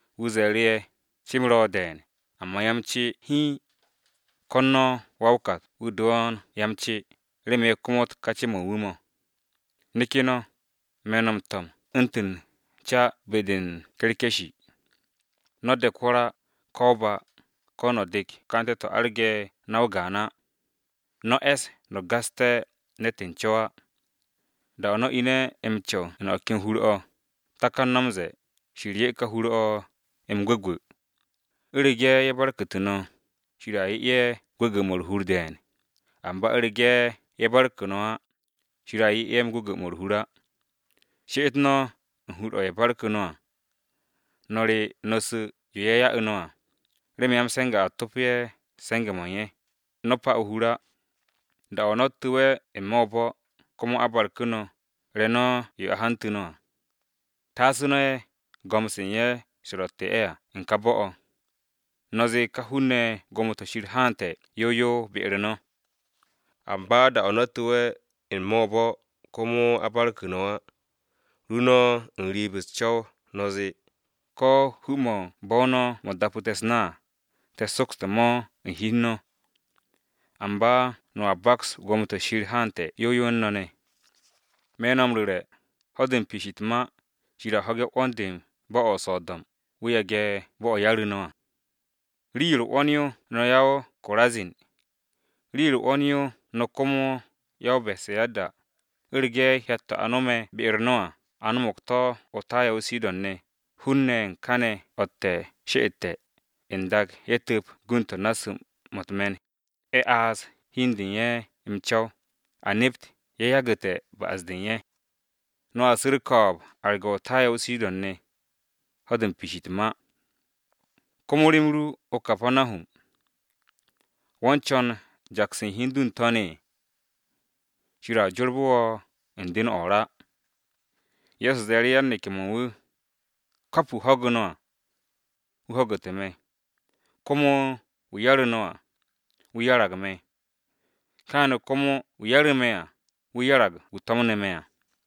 Wu̱ ze̱e̱ru̱ ye̱, “Ce-m ro̱ de̱e̱n, amba ya-m-ce hiin. Ko̱n no̱ wa-o-kat-wu̱ do̱o̱n ya-m-ce, remen ye̱ komot ka ce-mo̱ u̱n wu̱ mo̱. Neke̱ no̱! Me̱ no̱ m-to̱m u̱ntu̱n ca be-de u̱n ye̱ge̱-dur. No̱ de̱k hwo̱r á, ko̱ o-ba, ko̱ no̱ dek ka'ante̱-to̱ arge̱ na-o o-gaan á. No̱ e̱s no̱ gaste̱ ne̱t u̱n co̱w á. “Da-o̱ no̱ ine̱ m-co̱w u̱n o̱ ken hur-o̱, takan no̱ m-ze̱e̱, ‘Shir 'ye ka hur-o̱ m-gwu̱gwu̱.’ U̱rege̱ ye̱ barku̱tu̱ no̱, Shir a 'ye ye̱ gwu̱gwu̱-mo̱ u̱r-hur de̱e̱n. Amba u̱rege̱ ye̱ barku̱ no̱ á, Shir a 'ye ye̱ gwu̱gwu̱-mo̱ u̱r-hur á. She'et no̱ u̱n hur-o̱ u̱n ye̱ barku̱ no̱ à, no̱ re̱ no̱ su̱ yo ye̱ ya'u̱ no̱ à, remen ya-m-se̱nge̱ a topo ye̱ se̱nge̱-mo̱ u̱n ye̱. No̱ pa u̱t-hur á. “Da-o̱ no̱ tu̱we̱ n-me̱ o-bo̱, komo a barku̱ no̱, re̱ no̱ yo a hantu̱ no̱ à. Taas no̱ ye̱, go̱m-se u̱n ye̱ se̱ ye̱ ro̱tte̱ à u̱n ka bo̱-o̱. No̱ zee ka hun-ne̱ ye̱, ‘Gwo̱mo-to̱ Shir haante̱ yow yow be-u̱r no̱.’ Amba da-o̱ no̱ tu̱we̱ n-me̱ o-bo̱ komo a barku̱ no̱ á, ru no̱ u̱n riib u̱s-co̱w no̱ zee, ‘Ko̱ hu-mo̱ u̱n bo̱-o no̱ mo̱ dapu̱te̱ u̱s-na à, te̱ sokste̱ mo̱ u̱n hi u̱n no̱. Amba no̱a baks gwo̱mo-to̱ Shir haante̱ yow yow u̱n no̱ ne̱!’ Me̱ no̱ m-ru̱re̱, ho̱-de u̱n piish u̱t-ma, Shir a ho̱ge̱ 'wo̱n-de bo̱-o̱ o-So̱do̱m wu̱ yage̱ ka bo̱-o̱ 'yaru̱ no̱ à! “Rii-yo u̱r-'wo̱n yo no̱ ya-o-Korazin! Rii-yo u̱r-'wo̱n yo no̱ komo ya-o-Besayada! U̱rege̱ hyat-to̱ a no̱me̱ be-u̱r no̱ à, a no̱mo̱g to̱ o-Taya o-Sidon ne̱, hun-ne̱ ye̱ u̱n kane̱ o̱tte̱ she'ete̱, n-dak ye̱ tu̱p gund-to̱ u̱n naasu̱-mo̱ u̱t-me̱n, ye̱ aase̱ hi u̱n de u̱n ye̱ m-co̱w, a nept ye̱ yagu̱te̱ ba'as-de u̱n ye̱. No̱a su̱ u̱r-ko̱o̱b arge̱ o-Taya o-Sidon ne̱, ho̱-de u̱n piish u̱t-ma. Komo rem ru, o-Kapanahum! ¿Wo̱ u̱n co̱n jaks u̱n hi u̱n du n-To̱n u̱n shir? Shir a jorbu̱ wo̱ u̱n kuub-o̱ o-ra!” Ye̱so ze̱e̱ru̱ yan-neke̱-mo̱ u̱n wu̱, “Kap wu̱ ho̱gu̱ no̱ à, wu̱ ho̱gu̱te̱ me̱, komo wu̱ 'yare̱ no̱ à, wu̱ 'yarag me̱, kaane̱ komo wu̱ 'yare̱ me̱ à, wu̱ 'yarag wu̱ to̱mne̱ me̱ à.”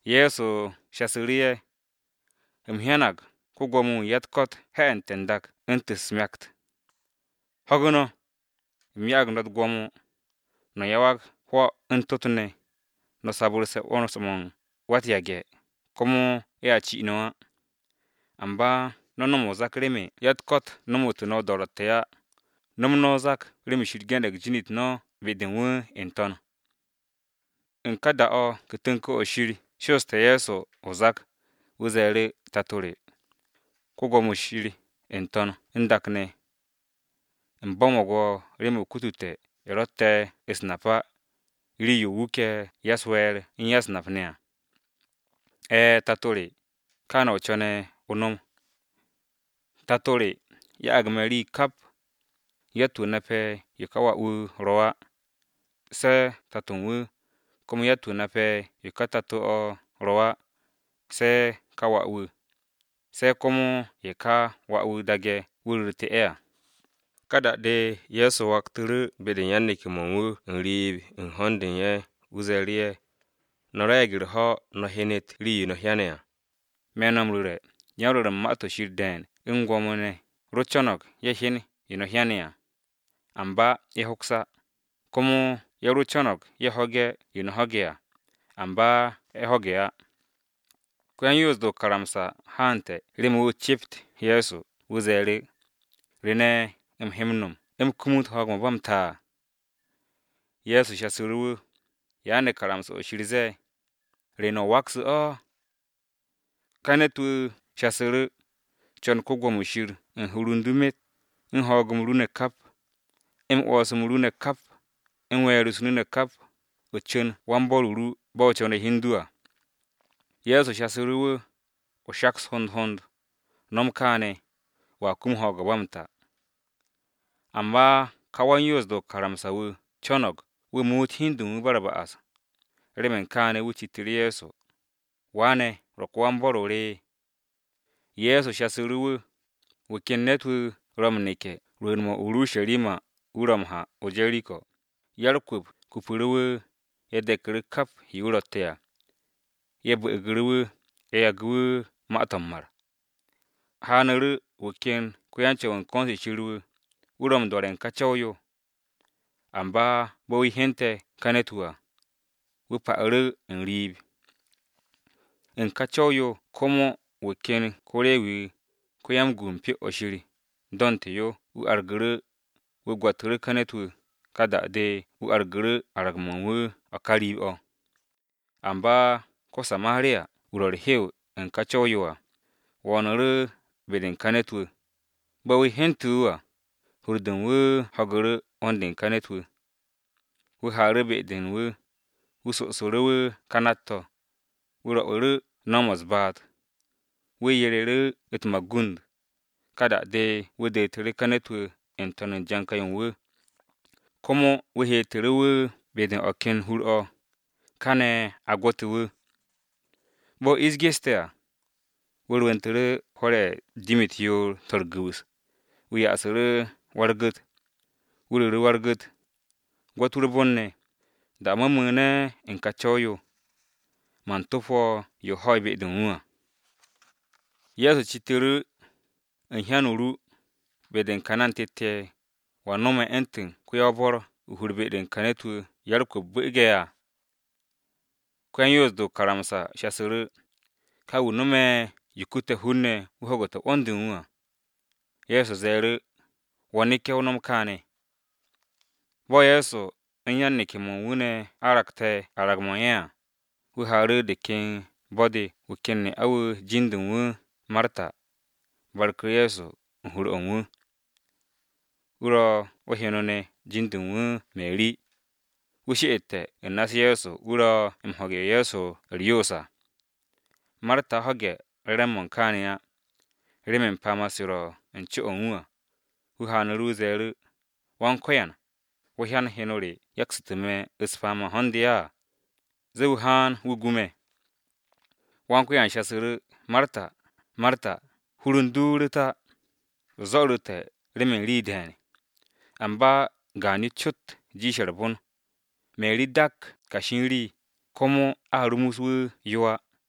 Ye̱so shasu̱ru̱ ye̱, “U̱m hyanag ko-Gwo̱mo-wu̱ u̱n ya-u̱t-ko̱t he̱'e̱nte̱ n-dak u̱ntu̱n u̱s-myakt. Ho̱gu̱ no̱! U̱m ya'ag no̱ u̱t-gwo̱mo, no̱ yawag hwo̱, u̱n tot-ne̱, no̱ sabu̱rse̱ 'wo̱ns-mo̱ u̱n wa-u̱t-yage̱, komo ye̱a ci no̱ á. Amba no̱ no̱m o-zak remen ya-u̱t-ko̱t nomotu̱ no̱ o-do̱ro̱tte̱ á, no̱m no̱ o-zak remen Shir ge̱ne̱g jin-u̱t no̱ be-de wu̱ n-to̱n.” U̱n ka da-o̱ Ku̱kt-o Shir sho̱'o̱ste̱ Ye̱so o-zak, wu̱ ze̱e̱ru̱, “Tato re, Wan-Ko̱yan n-To̱n u̱n dak ne̱, u̱m bo̱mo̱g wo̱ remen o kutute̱ ye̱ rotte̱ u̱s-nap á, rii-yo o wuke̱ ya-u̱s-we̱e̱r u̱n ya-u̱s-nap ne̱ à. E̱e̱, tato re, kaane̱ o co̱ne̱ o nom. “Tato re, ya'ag me̱ rii kap. Yatt-wu̱ nape̱ yo ka wà-wu̱ ro̱ á, se̱ tato u̱n wu̱, komo yatt-wu̱ nape̱ yo ka tato-o̱ ro̱ á, se̱ ka wà-wu̱, se̱ komo ye̱ ka wà-wu̱ daage̱ wu̱ ru̱ru̱te̱ ye̱ à.” Ka da-de Ye̱so waktu̱ru̱ be-de u̱n yan-neke̱-mo̱ u̱n wu̱ u̱n riib u̱n ho̱n-de u̱n ye̱ wu̱ ze̱e̱ru̱ ye̱, “No̱ re̱e̱g u̱r-ho̱ no̱ hyenet rii-yo no̱ hyane̱ à! Me̱ no̱ m-ru̱re̱, yan-rwo̱r u̱n Ma-to̱ Shir de̱e̱n u̱n gwo̱mo-ne̱ ro co̱no̱g ye̱ hyen yo no̱ hyane̱ à, amba ye̱ hoks á, komo ye̱ ro co̱no̱g ye̱ ho̱ge̱ yo no̱ ho̱ge̱ à, amba ye̱ ho̱ge̱ á.” Wan-napse̱ o-karamsa haante̱ remen wu̱ ce'ept Ye̱so. Wu̱ zee, “Wa-u̱r-Yoos, ¿re ne̱ u̱m he m-no̱m u̱m kumut ho̱o̱g-o̱ ba m-ta?” Ye̱so shasu̱ru̱ wu̱, “¿Ya ne̱ karamsa-o Shir zee? ¿Re ne̱ o wakse̱ o̱?” Ka ne̱t-wu̱ shasu̱ru̱, “Co̱n Yawe Shir ru u̱n hur u̱n du myet, u̱n ho̱o̱g-m ru ne̱ kap, u̱n 'wo̱ns-m ru ne̱ kap, u̱n we̱e̱r-u̱s ru ne̱ kap, o cu̱n wan-bo̱r-o ru bo̱ o co̱ne̱ hi u̱n du à.” Ye̱so shasu̱ wu̱, “O shaks hond hond, no̱m kaane̱, wo̱a kum ho̱o̱g-o̱ ba m-ta.” Amba ka wan-Yoos-de o-karamsa wu̱ co̱no̱g wu̱ muut hi u̱n de u̱n wu̱ ba u̱r-ba'as, remen kaane̱ wu̱ citu̱ru̱ Ye̱so, “¿Wa ne̱ ro̱ ko-wan-bo̱r-o re?” Ye̱so shasu̱ru̱ wu̱, “Wu̱ ken ne̱t-wu̱ ro̱ m-neke̱ rwu̱u̱n-mo̱ o-Urusharima wu̱ ro̱ m-ha o-Jeriko, ya-u̱r-kwu̱p kupu̱ru̱ wu̱, ye̱ deku̱ru̱ kap yo wu̱ rotte̱ à, ye̱ bu̱u̱gu̱ru̱ wu̱, ye̱ yagu̱ wu̱ ma-to̱ m-mar. Haanu̱ru̱ wu̱ ken wan-Co̱w u̱n ko̱n-se Shir, wu̱ ro̱ m-do̱re̱ u̱n ka co̱w-yo, amba bo̱ wu̱ hyente̱ ka ne̱t-wu̱ à, wu̱ pa'u̱ru̱ u̱n riib. U̱n ka co̱w-yo komo wu̱ ken wu̱ ko-Rewi do̱nte̱ yo wu̱ argu̱ru̱, wu̱ gwo̱tu̱ru̱ ka ne̱t-wu̱, ka da-de wu̱ argu̱ru̱ arag-mo̱ u̱n wu̱ o̱ ka riib-o̱. Amba ko-Samariya-wu̱ ro̱ u̱r-hew u̱n ka co̱w-yo à, wo̱o̱nu̱ru̱ be-de u̱n ka ne̱t-wu̱, bo̱ wu̱ hyente̱ wu̱ à, hur-de u̱n wu̱ ho̱gu̱ru̱ 'wo̱n-de u̱n ka ne̱t-wu̱. Wu̱ haaru̱ be-de u̱n wu̱, wu̱ sosu̱ru̱ wu̱ ka nát-to̱, wu̱ rwo̱'u̱ru̱ no̱w-mo̱ u̱s-baat, wu̱ yereru̱ u̱t-magund, ka da-de wu̱ detu̱ru̱ ka ne̱t-wu̱ n-to̱n o-janka yo u̱n wu̱, komo wu̱ heetu̱ru̱ wu̱ be-de u̱n o̱ ken hur-o̱, kane̱ a gwo̱te̱ wu̱. Bo̱ ish geste̱ à, wu̱ rwu̱ntu̱ru̱ hwo̱r-ye̱ jir-u̱t yoor-to̱ u̱r-gu̱wu̱s, wu̱ yasu̱ru̱ wa-u̱r-gu̱t. Wu̱ ru̱ru̱ wa-u̱r-gu̱t, ‘Gwo̱t wu̱ u̱r-bon ne̱, da-o̱ me̱ mu̱u̱ne̱ u̱n ka co̱w-yo, man top wo̱ yo o ho̱'e̱ be-de u̱n wu̱ à.’” Ye̱so citu̱ru̱, “U̱n hyan-o ru, be-de u̱n ka hun-ne̱ tet ye̱, ¿wa no̱me̱ u̱ntu̱n ko-yan-bo̱r o-hur be-de u̱n ka ne̱t-wu̱ ya-u̱r-kwu̱p bu̱u̱ge̱ à?” Ko yan-Yoos-de o-karamsa shasu̱ru̱, “Ka wu̱ no̱me̱ yo kute̱ hun-ne̱ wu̱ ho̱gu̱te̱ 'wo̱n-de u̱n wu̱ à.” Ye̱so ze̱e̱ru̱, “Wo̱ neke̱, o no̱m kaane̱.” Bo̱ Ye̱so u̱n yan-neke̱-mo̱ u̱n wu̱ ne̱ aragte̱ arag-mo̱ u̱n ye̱ à, wu̱ haaru̱ de ken bo̱-de wu̱ ken ne'a-wu̱ jin-de u̱n wu̱ Marta, barku̱ru̱ Ye̱so u̱n hur-o̱ u̱n wu̱. Wu̱ ro̱ o-heno ne̱, jin-de u̱n wu̱ Meri, wu̱ she'ete̱ u̱n na-u̱s Ye̱so wu̱ ro̱ m-ho̱ge̱ yo Ye̱so ro̱ u̱r-yoos à. Marta ho̱ge̱ re̱re̱m-mo̱ u̱n kaane̱ á, remen se̱nge̱-mo̱ ro̱ u̱n co-o̱ u̱n wu̱ à, wu̱ haanu̱ru̱ wu̱ ze̱e̱ru̱, “Go̱s-wu̱, ¿wo̱ hyan heno re yaksu̱tu̱ me̱ m-se̱nge̱ u̱n ho̱n-de à? Zee wu̱ haan wu̱ gu me̱!” Go̱s-wu̱ shasu̱ru̱ wu̱, “Marta, Marta! Hur u̱n du ru̱t á, o zo̱ru̱te̱ remen rii de̱e̱n, amba gaan-yo cot, jiishe̱ u̱r-bon. Meri dak kashi u̱n rii. Komo a rumus wu̱ yo á.”